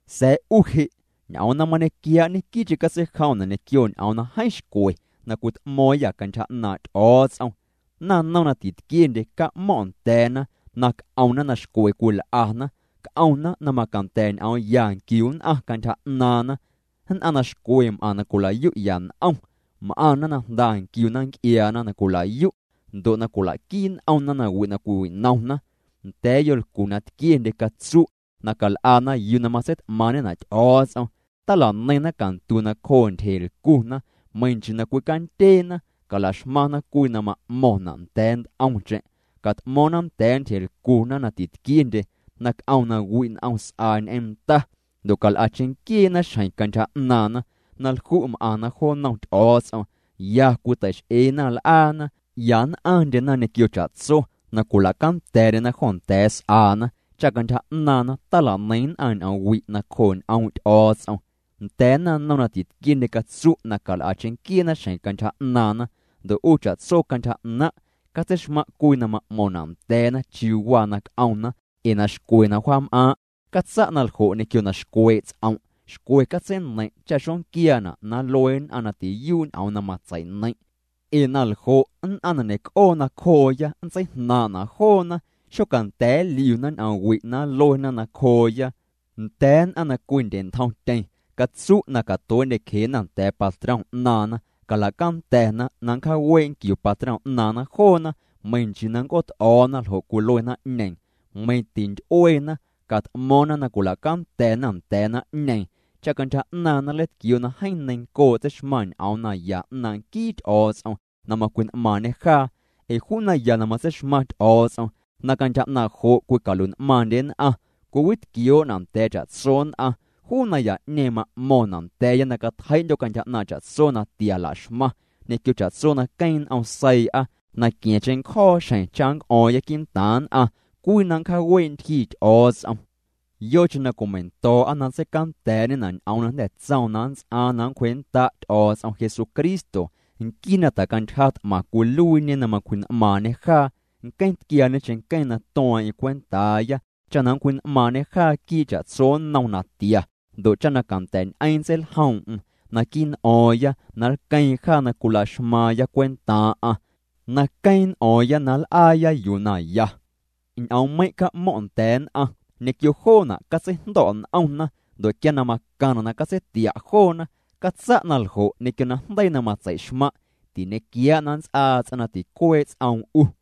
Sa̱a̱ 'u je', ñ'oom na mañequiaa', ñequii'cheⁿ catseijomna' ñequio ñ'oom na jeeⁿ xcwe na cwit'mo̱o̱ⁿyâ cantyja 'naaⁿ' Ty'o̱o̱ts'om. Naⁿnom na tquiendye, ca'mo̱ⁿ' nda̱a̱na na c'omna na xcwe cwil'ana, c'omna na macanda̱ ñ'oom ya nquiu nn'aⁿ cantyja 'naaⁿna, nn'aⁿ na xcwe m'aⁿ na cwila'yu'ya n'om, m'aⁿna na jnda nquiuna nc'iaana na cwila'yu', ndo' na cwila'quii n'omna nawi' na cwiwinomna. Nda̱a̱ yolcu na tquiendye, catsu' na cal'ana yuu na matseit'maaⁿ'ñena' Ty'o̱o̱ts'om. Tala'neiⁿna cantu nacjoo ntyjelcuna, meiⁿ nchii na cwicandyeena. Calaxmaⁿna cwii na ma'mo̱ⁿna' nda̱a̱ nt'omcheⁿ, cat'mo̱o̱ⁿna nda̱a̱ ntyjelcuna na titquiendye na c'om na wi' n'om s'aa ñ'eⁿ nda, ndo' cal'a cheⁿnquieena xjeⁿ cantyja 'naaⁿna, na lju' m'aⁿna jo nnom Ty'o̱o̱ts'om, ya cwitei'x'eena l'aana, ya nn'aⁿndyena ñequio cha'tso, na cwila'canda̱a̱'ndyena jo nda̱a̱ s'aana, cha cantyja 'naaⁿna tala'neiⁿ nn'aⁿ ñ'oomwi' nacjoo' ñ'oom' Ty'o̱o̱ts'om. Nda̱a̱ naⁿnom na titquiendye catsu' na cal'a cheⁿnquieena xjeⁿ cantyja 'naaⁿna, ndo' 'u cha'tso cantyja 'naⁿ', catseixmaⁿ' cwii na ma'mo̱ⁿna' nda̱a̱na chiuu na c'omna ee na xcwe na wja'm'aaⁿ'. Catsa' naljo' ñequio na xcwee' ts'om', xcwe catseineiⁿ' cha xonquiaana' na nlue nn'aⁿ na tiyuu' ñ'oom na matsei'neiⁿ'. Ee naljo' nn'aⁿ na ñe'c'oo nacjooya nntseijnaaⁿ'na' joona, xocanda̱a̱ nliuna ñ'oomwi' na nluena nacjooya. Nda̱a̱ nn'aⁿ na cwindye'ntjomtyeⁿ, catsu' na catuee'ndyecjena nda̱a̱ patrom 'naaⁿna. Cala'canda̱na na nncjaawee' nquiu patrom 'naaⁿna joona meiⁿ nchii nnc'oot'o̱o̱na ljo' cwilue naⁿ'ñeeⁿ. Meiⁿ tinty'ueena, cat'mo̱o̱ⁿna na cwila'canda̱a̱na nda̱a̱ naⁿ'ñeeⁿ, cha cantyja 'naaⁿna nleitquioo' na jeeⁿ neiⁿncoo' tseixmaⁿ ñ'oom naya 'naaⁿ' nquii Ty'o̱o̱ts'om na macwji'n'maaⁿñê jaa. Ee juu naya na matseixmaⁿ Ty'o̱o̱ts'om na cantyja 'naaⁿ' jo' cwicalui'n'maaⁿndye nn'aⁿ cwiwitquioo'na' nda̱a̱ cha'tso nn'aⁿ, juu naya'ñeeⁿ ma'mo̱ⁿna' nda̱a̱ya na catjei'ndyo̱ cantyja 'naaⁿ cha'tso natia laxmaⁿ, ñequio cha'tso na queeⁿ n'om seii'a, na qua̱ⁿ cheⁿncjo̱o̱ xjeⁿ cha nnc'o̱o̱ⁿya quii'ntaaⁿ nn'aⁿ cwii na nncjaawee' ntyjii Ty'o̱o̱ts'om, yocheⁿ na cwimeiⁿndo̱o̱'a na nntseicanda̱a̱'ñena' ñ'oom na jnda̱ tsoom na nnts'aaⁿ na nncwjee'nnda' Ty'o̱o̱ts'om Jesucristo nquii na tjacantyja t'maⁿ cwiluiiñe na macwji'n'maaⁿñê jaa. Nqueⁿ tquiaañe cheⁿnqueⁿ na tueeⁿ'eⁿ cwentaaya cha na nncwji'n'maaⁿñê jaa quii' cha'tso nnom natia, ndo' cha na canda̱a̱'ñ'eⁿ nntseiljoom'm naquii' n'o̱o̱ⁿya, na nlqueeⁿ jaa na cwilaxmaaⁿya cwentaaⁿ'aⁿ, na queeⁿ n'o̱o̱ⁿya na nl'aaya yuu na ya. Ñ'oommeiⁿ' ca'mo̱ⁿ' nda̱a̱ nn'aⁿ. Ñequio joona' catseijndo̱' n'omna, ndo' quia na macaⁿna' na catseitia' joona, catsa' na ljo' ñequio najndeii na matseixmaⁿ'. Tiñequiaa' na nnts'aa ts'aⁿ na ticuee' ts'oom 'u.